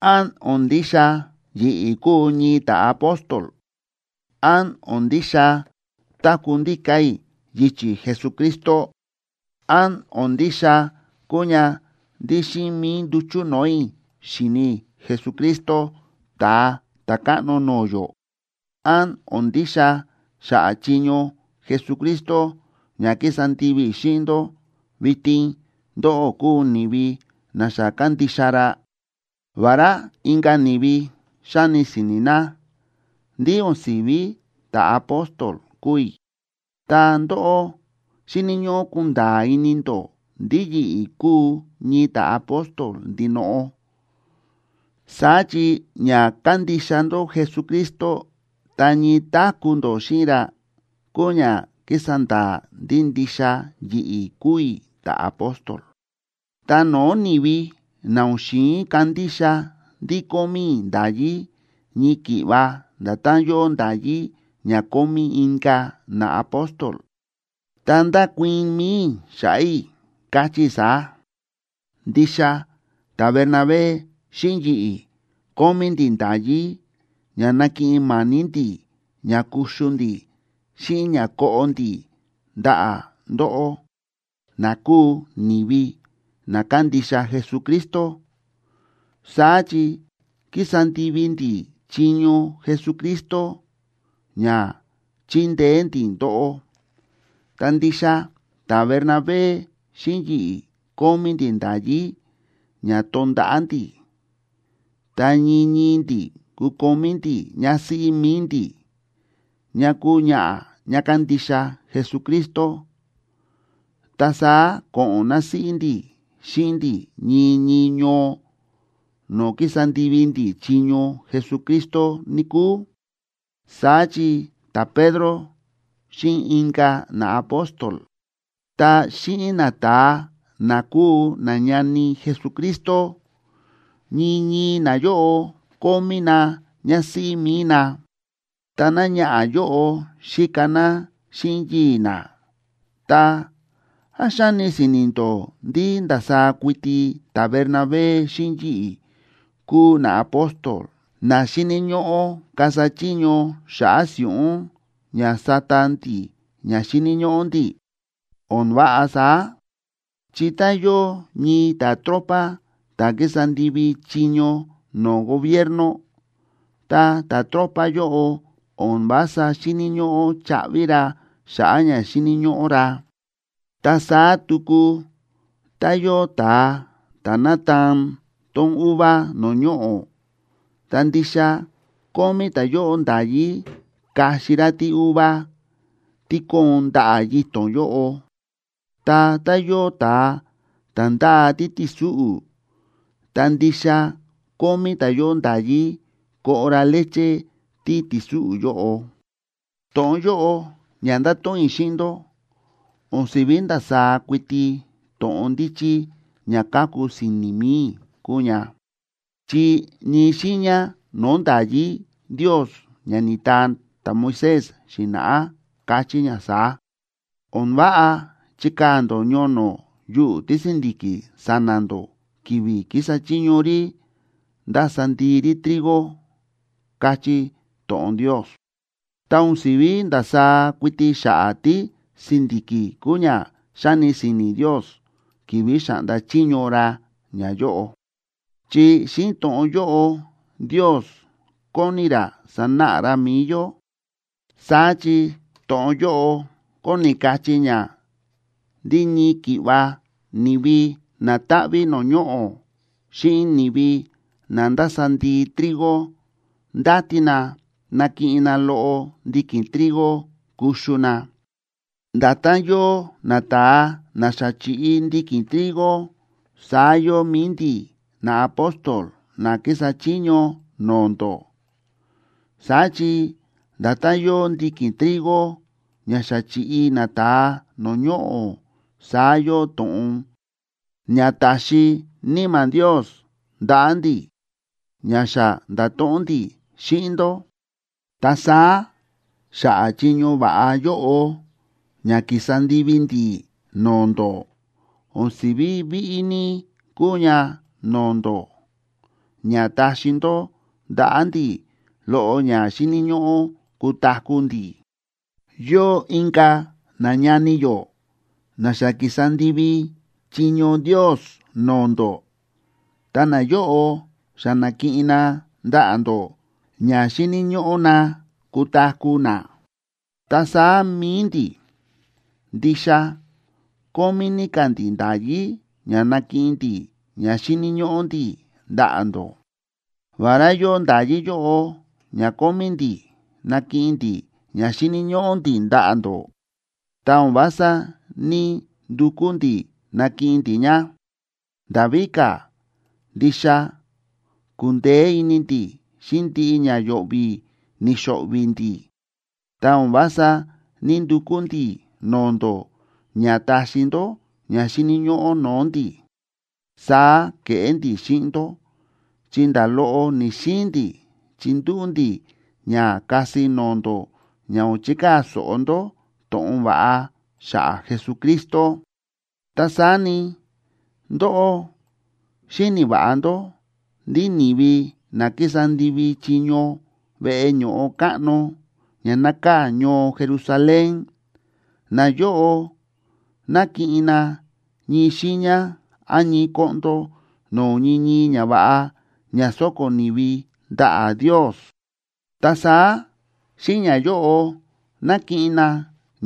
¿Án o̱n ndixa yi̱ꞌi̱ kúu ñii ta̱apóstol? ¿Án o̱n ndixa táku̱ ndíka̱ i̱ yichi̱ Jesucristo? ¿Án o̱n ndixa kúu ña ndí xíꞌin mi̱i nduchu̱ no̱o̱ i̱ xi̱ni i̱ Jesucristo Ta̱a Ta̱káꞌno no̱o̱ yó? ¿Án o̱n ndixa xa̱ꞌa̱ chiño Jesucristo ña ki̱sa ndivi i̱ xíꞌin ndó, vitin ndóꞌó kúu ni̱vi na xa kándixa ra? Vará inka̱ ni̱vi xáni si̱ni̱ na ndí o̱n si̱ví ta̱apóstol kúu i̱, ta ndóꞌó xíni̱ ñóꞌó kunda̱a̱ ini ndó ndí yi̱ꞌi̱ kúu ñii ta̱apóstol ndinoꞌo. Saá chi ña kándixa ndó Jesucristo ta ñii táku̱ ndó xíꞌin ra kúu ña kísa nda̱a̱ ndí ndixa yi̱ꞌi̱ kúu i̱ ta̱apóstol. Ta no̱o̱ ni̱vi na o̱n xi̱in kandixa ndí kómí i̱ nda̱yí ñii ki̱ꞌva nda̱tán yóo nda̱yí ña kómí inka̱ naapóstol, ta ndákuii̱n mi̱i i̱ xa̱ꞌa̱ i̱, káchí i̱ saá: Ndixa ta̱Bernabé xíꞌin yi̱ꞌi̱ kómí ndi̱ nda̱yí ña nakiꞌin ma̱ni̱ ndi̱ ña kuxu ndi̱ xíꞌin ña koꞌo ndi̱ ndaꞌa̱ ndóꞌó, na kúu ni̱vi na kándixa Jesucristo. Saá chi kísa ndivi ndi̱ chiño Jesucristo ña chíndeé ndi̱ ndóꞌó. Ta ndixa ta̱Bernabé xíꞌin yi̱ꞌi̱ kómí ndi̱ nda̱yí ña tonda̱ꞌa̱ ndi̱, ta ñii ñii ndi̱ kukomí ndi̱ ñásíꞌí mi̱i ndi̱, ñá kúu ñaꞌa̱ ñá kándixa Jesucristo, ta saá ko̱ꞌo̱n násíꞌí ndi̱ xíꞌin ndi̱ ñii ñii ñoo no̱o̱ kísa ndivi ndi̱ chiño Jesucristo, níkúu. Saá chi ta̱Pedro xíꞌin inka̱ naapóstol ta xíꞌin nata̱a na kúu nañani Jesucristo, ñii ñii nayóꞌo kómí na ñásíꞌí mi̱i na, ta náñaꞌa̱ yóꞌo xíka ná xíꞌin yii̱ ná. Ta, ¿án xáni si̱ni̱ ndó ndí ndasaá kuiti ta̱Bernabé xíꞌin yi̱ꞌi̱ kúu naapóstol na xíni̱ ñóꞌó kasa chiño xa̱ꞌa̱ si̱ꞌún ña sata ndi̱ ña xíni̱ ñóꞌó ndi̱? O̱n váꞌa saá, chi tá yóo ñii ta̱tropa ta̱ kísa ndivi chiño no̱o̱ gobierno, ta ta̱tropa yóꞌo o̱n vása xíni̱ ñóꞌó chaꞌvi ra xa̱ꞌa̱ ña xíni̱ ñóꞌó ra. Ta saá tuku tá yóo ta̱a ta̱ nátaan tón uva no̱o̱ ñoꞌo̱, ta ndixa kómí ta̱yóꞌo nda̱yí kaxi ra tíuva tí kóon ndaꞌa̱ yito̱n yóꞌo. Ta tá yóo ta̱a ta̱ ndáa títi̱súꞌu̱, ta ndixa kómí ta̱yóꞌo nda̱yí koꞌo ra leche títi̱súꞌu̱ yóꞌo. To̱ꞌon yóꞌo ña ndáto̱ꞌon i̱ xíꞌin ndó o̱n si̱ví ndasaá kuiti to̱ꞌon ndíchí ña káku si̱ni̱ mi̱i i̱ kúu ña, chi ñii xiiña no̱o̱ nda̱yí Ndios ña ni̱taa ta̱Moisés xi̱na̱ꞌá káchí ña saá: “O̱n váꞌa chikaa̱ ndó ñono̱ yuꞌu̱ tísi̱ndi̱ki̱ sa̱na̱ ndó ki̱vi̱ kísa chiño rí ndása ndii rí trigo”, káchí to̱ꞌon Ndios. Ta o̱n si̱ví ndasaá kuiti xa̱ꞌa̱ tísi̱ndi̱ki̱ kúu ña xáni si̱ni̱ Ndios ki̱vi̱ xa̱ꞌnda chiño ra ñayóꞌo, chi xíꞌin to̱ꞌon yóꞌo, Ndios kóni ra sanáꞌa ra mi̱i yó. Saá chi to̱ꞌon yóꞌo kóni kachí ña ndí ñii ki̱ꞌva ni̱vi na táꞌví no̱o̱ ñoꞌo̱ xíꞌin ni̱vi na ndása ndii trigo ndáti na nakiꞌin na loꞌo ndiki̱n trigo kuxu na. Nda̱tán yóo nata̱a na xa chi̱ꞌi ndiki̱n trigo, saá yóo mi̱i ndi̱ naapóstol na kísa chiño no̱o̱ ndó. Saá chi nda̱tán yóo ndiki̱n trigo ña xa chi̱ꞌi nata̱a no̱o̱ ñoꞌo̱, saá yóo to̱ꞌon ña ta̱xi Níma̱ Ndios ndaꞌa̱ ndi̱, ña xa nda̱to̱ꞌon ndi̱ xíꞌin ndó. Ta saá xa̱ꞌa̱ chiño va̱ꞌa yóꞌo ña ki̱sa ndivi ndi̱ no̱o̱ ndó, o̱n si̱ví víꞌí ní kúu ña no̱o̱ ndó ña taxi ndó ndaꞌa̱ ndi̱ loꞌo ña xíni̱ ñóꞌó kutaku̱ ndi̱. Yóo inka̱ nañani yó na xa ki̱sa ndivi chiño Ndios no̱o̱ ndó, ta nayóꞌo xa na̱kiꞌin na ndaꞌa̱ ndó ña xíni̱ ñóꞌó na kutaku̱ na. Ta saá mi̱i ndi̱, ndixa kómí ní ka̱ ndi̱ nda̱yí ña nakiꞌin ndi̱ ña xíni̱ ñóꞌó ndi̱ ndaꞌa̱ ndó. Vará yóo nda̱yí yóꞌo ña kómí ndi̱ nakiꞌin ndi̱ ña xíni̱ ñóꞌó ndi̱ ndaꞌa̱ ndó, ta o̱n vása ní‑ndukú ndi̱ nakiꞌin ndi̱ ña. Nda̱ víka̱, ndixa ku̱ndeé ini ndi̱ xíꞌin ndiꞌi ña yo̱ꞌvi̱ ni̱xo̱ꞌvi̱ ndi̱, ta o̱n vása ní‑ndukú ndi̱ no̱o̱ ndó ña taxi ndó ña xíni̱ ñóꞌó no̱o̱ ndi̱. Saá ke̱ꞌé ndi̱ xíꞌin ndó, chi nda̱ loꞌo ni̱‑xiin ndi̱ chindúꞌu̱ ndi̱ ña kasi no̱o̱ ndó ña o̱n chikaa̱ so̱ꞌo ndó to̱ꞌon va̱ꞌa xa̱ꞌa̱ Jesucristo. Ta saá ni, ndóꞌó xíni̱ va̱ꞌa ndó ndí ni̱vi na kísa ndivi chiño veꞌe ño̱ꞌo káꞌno ña nákaa̱ ñoo Jerusalén, nayóꞌo nákiꞌin na ñii xiiña án ñii koꞌndo no̱o̱ ñii ñii ñava̱ꞌa ña sóko̱ ni̱vi ndaꞌa̱ Ndios, ta saá xíꞌin ñayóꞌo nákiꞌin na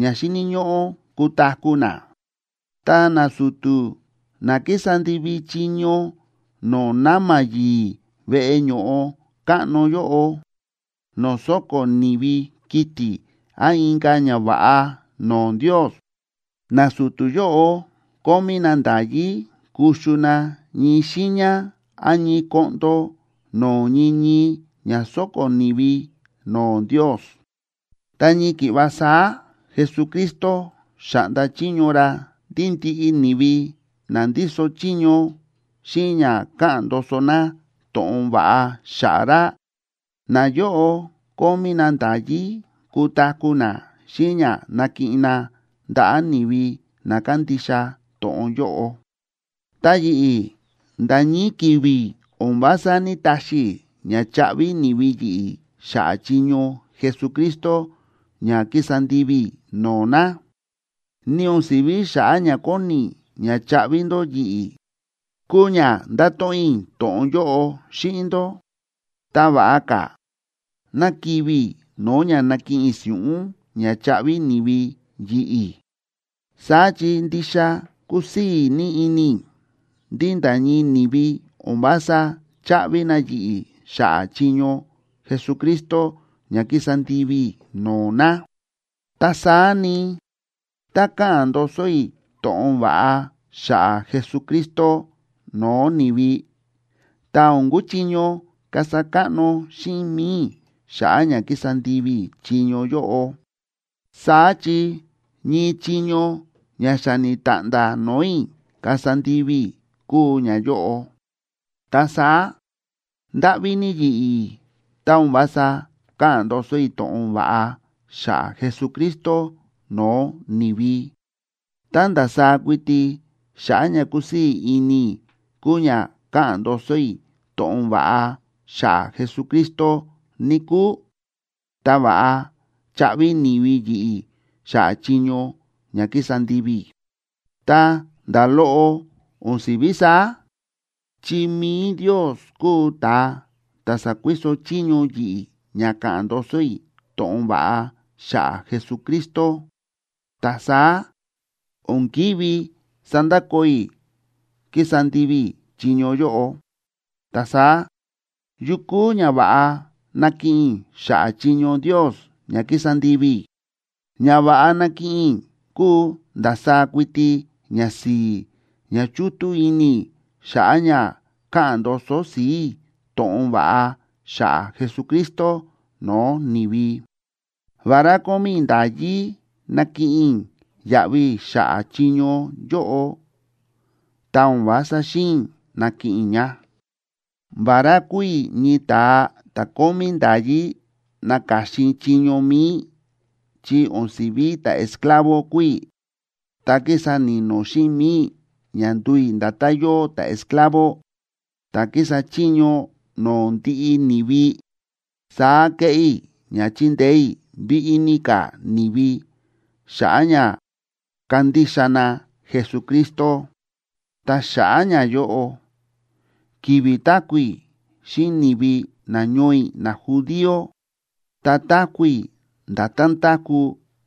ña xíni̱ ñóꞌó kutaku̱ na. Ta nasu̱tu̱ na kísa ndivi chiño no̱o̱ na̱ma̱ yi̱i̱ veꞌe ño̱ꞌo káꞌno yóꞌo, no̱o̱ sóko̱ ni̱vi kiti̱ án inka̱ ñava̱ꞌa no̱o̱ Ndios, nasu̱tu̱ yóꞌo kómí na nda̱yí kuxu na ñii xiiña án ñii koꞌndo no̱o̱ ñii ñii ña sóko̱ ni̱vi no̱o̱ Ndios. Ta ñii ki̱ꞌva saá Jesucristo xa̱ꞌnda chiño ra ndí ndiꞌi ni̱vi na ndíso chiño xíꞌin ña káꞌa̱n ndoso na to̱ꞌon va̱ꞌa xa̱ꞌa̱ ra, nayóꞌo kómí na nda̱yí kutaku̱ na xíꞌin ña nákiꞌin na ndaꞌa̱ ni̱vi na kándixa to̱ꞌon yóꞌo. Ta yi̱ꞌi̱, nda̱ ñii ki̱vi̱ o̱n vása ní‑taxi i̱ ña chaꞌvi ni̱vi yi̱ꞌi̱ xa̱ꞌa̱ chiño Jesucristo ña kísa ndivi i̱ no̱o̱ na. Ni o̱n si̱ví xa̱ꞌa̱ ña kóni i̱ ña chaꞌvi ndó yi̱ꞌi̱ kúu ña ndáto̱ꞌon i̱ to̱ꞌon yóꞌo xíꞌin ndó. ¡Ta va̱ꞌa ka̱ ná kivi̱ i̱ no̱o̱ ña nakiꞌin i̱ si̱ꞌún ña chaꞌvi ni̱vi yi̱ꞌi̱! Saá chi ndixa kúsii̱ ní ini i̱ ndí nda̱ ñii ni̱vi o̱n vása cháꞌvi na yi̱ꞌi̱ xa̱ꞌa̱ chiño Jesucristo ña kísa ndivi i̱ no̱o̱ na. Ta saá ni, tá káꞌa̱n ndoso i̱ to̱ꞌon va̱ꞌa xa̱ꞌa̱ Jesucristo no̱o̱ ni̱vi, ta o̱n kuchiño kasa káꞌno xíꞌin mi̱i i̱ xa̱ꞌa̱ ña kísa ndivi i̱ chiño yóꞌo. Saá chi ñii chiño ña xa ni̱ta̱ꞌnda̱ no̱o̱ i̱ kasa ndivi i̱ kúu ñayóꞌo. Ta saá, ¡ndáꞌví ní yi̱ꞌi̱, tá o̱n vása ka̱ꞌa̱n ndoso i̱ to̱ꞌon va̱ꞌa xa̱ꞌa̱ Jesucristo no̱o̱ ni̱vi! Tá ndasaá kuiti xa̱ꞌa̱ ña kúsii̱ ini i̱ kúu ña káꞌa̱n ndoso i̱ to̱ꞌon va̱ꞌa xa̱ꞌa̱ Jesucristo, níkúu, ta va̱ꞌa chaꞌvi ni̱vi yi̱ꞌi̱ xa̱ꞌa̱ chiño ña kísa ndivi i̱. Ta nda̱ loꞌo o̱n si̱ví saá, chi mi̱i Ndios kúu ta̱a ta̱ sa̱kuiso chiño yi̱ꞌi̱ ña ka̱ꞌa̱n ndoso i̱ to̱ꞌon va̱ꞌa xa̱ꞌa̱ Jesucristo, ta saá o̱n ki̱ví sandakoo i̱ kísa ndivi i̱ chiño yóꞌo. Ta saá, ¿yu kúu ñava̱ꞌa nakiꞌin i̱ xa̱ꞌa̱ chiño Ndios ña kísa ndivi i̱? Ñava̱ꞌa nákiꞌin i̱ kúu ndasaá kuiti ñasi̱i̱ ña chútú ini i̱ xa̱ꞌa̱ ña káꞌa̱n ndoso si̱i̱ i̱ to̱ꞌon va̱ꞌa xa̱ꞌa̱ Jesucristo no̱o̱ ni̱vi. Vará kómí i̱ nda̱yí nakiꞌin i̱ yaꞌvi xa̱ꞌa̱ chiño yóꞌo, ta o̱n vása xi̱in i̱ nakiꞌin i̱ ña. Vará kúu i̱ ñii ta̱a ta̱ kómí nda̱yí naka̱xin i̱ chiño mi̱i i̱ chi o̱n si̱ví ta̱esclavo kúu i̱, ta ki̱sa ni̱no̱ xíꞌin mi̱i i̱ ña nduu i̱ nda̱tán yóo ta̱esclavo ta̱ kísa chiño no̱o̱ ndiꞌi ni̱vi. Saá kéꞌé i̱ ña chindeé i̱ víꞌí ní ka̱ ni̱vi xa̱ꞌa̱ ña kandixa na Jesucristo. Ta xa̱ꞌa̱ ñayóꞌo, ki̱vi̱ táku̱ i̱ xíꞌin ni̱vi nañoo i̱ najudío, ta táku̱ i̱ nda̱tán táku̱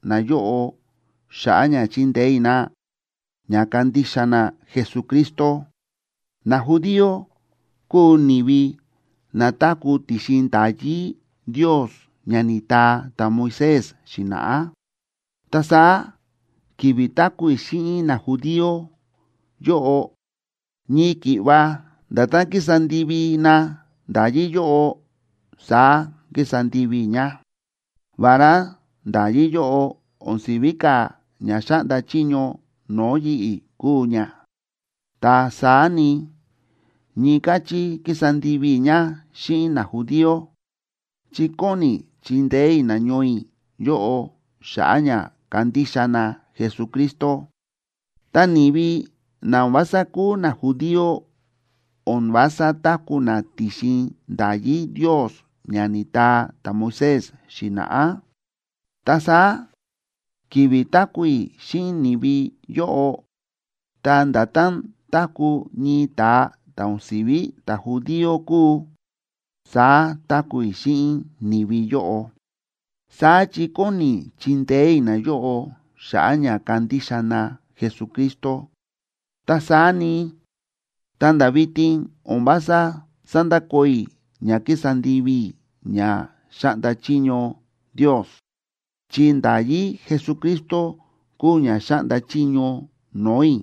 nayóꞌo xa̱ꞌa̱ ña chindeé i̱ na ña kandixa na Jesucristo. Najudío kúu ni̱vi na táku̱ ti̱xin nda̱yí Ndios ña ni̱taa ta̱Moisés xi̱na̱ꞌá, ta saá ki̱vi̱ táku̱ i̱ xíꞌin najudío yóꞌo, ñii ki̱ꞌva nda̱tán kísa ndivi na nda̱yí yóꞌo, saá kísa ndivi i̱ ña. Vará nda̱yí yóꞌo o̱n si̱ví ka̱ ña xáꞌnda chiño no̱o̱ yi̱ꞌi̱ kúu ña, ta saá ni, ñii káchí kísa ndivi i̱ ña xíꞌin najudío, chi kóni i̱ chindeé i̱ nañoo i̱ yóꞌo xa̱ꞌa̱ ña kandixa na Jesucristo. Ta ni̱vi na o̱n vása kúu najudío o̱n vása táku̱ na ti̱xin nda̱yí Ndios ña ni̱taa ta̱Moisés xi̱na̱ꞌá, ta saá ki̱vi̱ táku̱ i̱ xíꞌin ni̱vi yóꞌo, ta nda̱tán táku̱ ñii ta̱a ta̱ o̱n si̱ví ta̱judío kúu, saá táku̱ i̱ xíꞌin ni̱vi yóꞌo. Saá chi kóni i̱ chindeé i̱ nayóꞌo xa̱ꞌa̱ ña kandixa na Jesucristo. Ta saá ni, ta̱nda̱ vitin o̱n vása sándakoo i̱ ña kísa ndivi i̱ ña xáꞌnda chiño Ndios, chi nda̱yí Jesucristo kúu ña xáꞌnda chiño no̱o̱ i̱.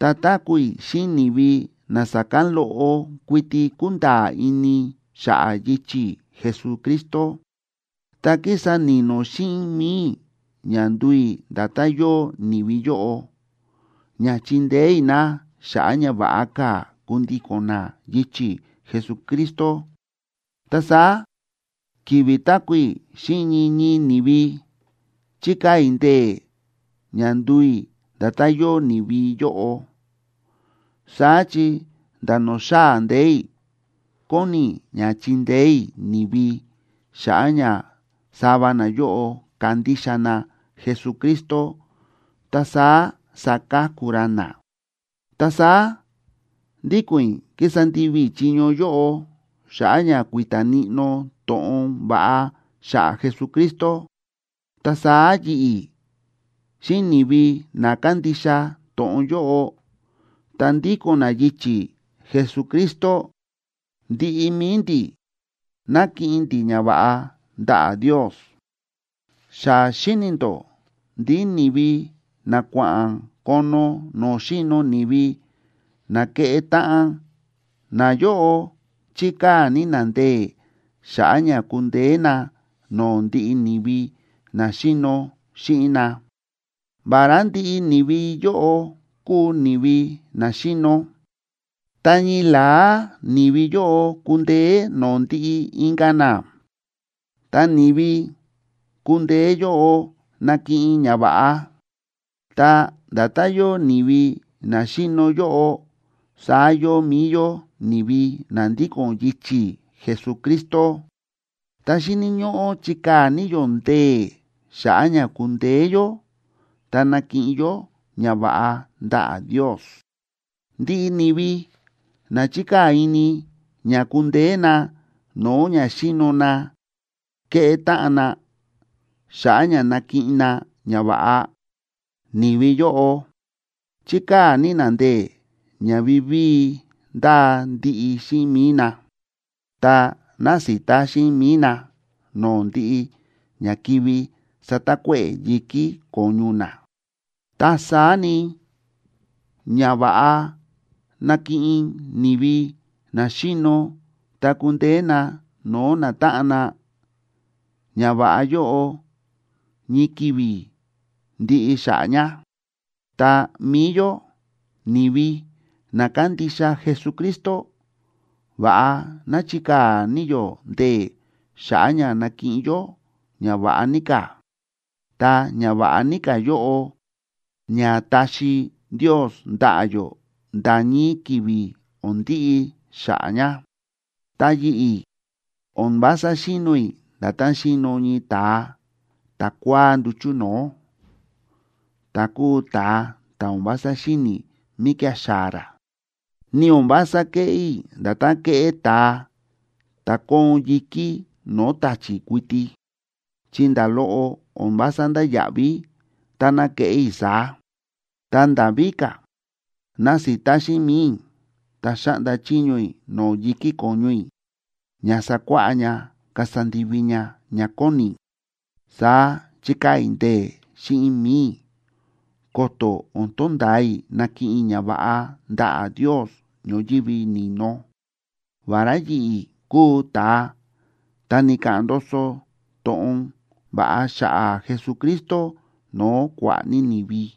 Tá táku̱ i̱ xíꞌin ni̱vi na sa̱kán loꞌo kuiti kúnda̱a̱ ini xa̱ꞌa̱ yichi̱ Jesucristo, ta kísa ni̱no̱ xíꞌin mi̱i i̱ ña nduu i̱ nda̱tán yóo ni̱vi yóꞌo, ña chindeé i̱ na xa̱ꞌa̱ ña va̱ꞌa ka̱ kundíko̱n na yichi̱ Jesucristo. Ta saá ki̱vi̱ táku̱ i̱ xíꞌin ñii ñii ni̱vi, chíkaa̱ i̱ ndee̱ ña nduu i̱ nda̱tán yóo ni̱vi yóꞌo. Saá chi nda̱ no̱o̱ xaa̱ ndee̱ i̱, kóni i̱ ña chindeé i̱ ni̱vi xa̱ꞌa̱ ña sava nayóꞌo kandixa na Jesucristo ta saá saka̱ku ra na. Ta saá ndíko̱n i̱ kísa ndivi i̱ chiño yóꞌo xa̱ꞌa̱ ña kui̱ta̱ níꞌnó to̱ꞌon va̱ꞌa xa̱ꞌa̱ Jesucristo. Ta saá yi̱ꞌi̱ xíꞌin ni̱vi na kándixa to̱ꞌon yóꞌo ta ndíko̱n na yichi̱ Jesucristo, ndiꞌi mi̱i ndi̱ nákiꞌin ndi̱ ñava̱ꞌa ndaꞌa̱ Ndios. Xa xíni̱ ndó ndí ni̱vi na kua̱ꞌa̱n kono no̱o̱ xíno ni̱vi na kéꞌé táꞌan, nayóꞌo chíkaa̱ ní na ndee̱ xa̱ꞌa̱ ña kundeé na no̱o̱ ndiꞌi ni̱vi na xíno xíꞌin na. Vará ndiꞌi ni̱vi yóꞌo kúu ni̱vi na xíno, ta ñii la̱á ni̱vi yóꞌo kundeé no̱o̱ ndiꞌi inka̱ na, ta ni̱vi kundeé yóꞌo nakiꞌin ñava̱ꞌa. Ta nda̱tán yóo ni̱vi na xíno yóꞌo, saá yóo mi̱i yó ni̱vi na ndíko̱n yichi̱ Jesucristo. Ta xíni̱ ñóꞌó chikaa̱ ní yó ndee̱ xa̱ꞌa̱ ña kundeé yó ta nakiꞌin yó ñava̱ꞌa ndaꞌa̱ Ndios. Ndiꞌi ni̱vi na chíkaa̱ ini ña kundeé na no̱o̱ ña xíno na kéꞌé táꞌan na xa̱ꞌa̱ ña nakiꞌin na ñava̱ꞌa, ni̱vi yóꞌo chíkaa̱ ní na ndee̱ ña vivíi ndáa ndiꞌi xíꞌin mi̱i na, ta násita xíꞌin mi̱i na no̱o̱ ndiꞌi ña kivi satakuéꞌe̱ yi̱kí ko̱ñu na. Ta saá ni, ñava̱ꞌa nákiꞌin ni̱vi na xíno tá ku̱ndeé na no̱o̱ natáꞌan na, ñava̱ꞌa yóꞌo ñii ki̱vi̱ ndiꞌi xa̱ꞌa̱ ña. Ta mi̱i yó, ni̱vi na kándixa Jesucristo, va̱ꞌa ná chikaa̱ ní yó ndee̱ xa̱ꞌa̱ ña nakiꞌin yó ñava̱ꞌa ní ka̱, ta ñava̱ꞌa ní ka̱ yóꞌo ña taxi Ndios ndaꞌa̱ yó nda̱ ñii ki̱vi̱ o̱n ndiꞌi xa̱ꞌa̱ ña. Ta yi̱ꞌi̱, o̱n vása xíno i̱ nda̱tán xíno ñii ta̱a ta̱kua̱á nduchu̱ no̱o̱, ta̱ kúu ta̱a ta̱ o̱n vása xíni̱ míkía̱ xaa̱ ra. Ni o̱n vása kéꞌé i̱ nda̱tán kéꞌé ta̱a ta̱ kóon yi̱kí no̱o̱ ta̱chi̱ kuiti, chi nda̱ loꞌo o̱n vása ndáya̱ꞌví táná keꞌé i̱ saá. Ta nda̱ víka̱, násita xíꞌin mi̱i i̱, ta xáꞌnda chiño i̱ no̱o̱ yi̱kí ko̱ñu i̱ ña sakuáꞌá ña kasa ndivi ña ña kóni i̱. Saá chíkaa̱ i̱ ndee̱ xíꞌin mi̱i i̱, ko̱to̱ o̱n tonda̱a i̱ nakiꞌin i̱ ñava̱ꞌa ndaꞌa̱ Ndios ñoyívi ni̱no, vará yi̱ꞌi̱ kúu ta̱a ta̱ ni̱ka̱ꞌa̱n ndoso to̱ꞌon va̱ꞌa xa̱ꞌa̱ Jesucristo no̱o̱ kua̱ꞌa̱ ní ni̱vi.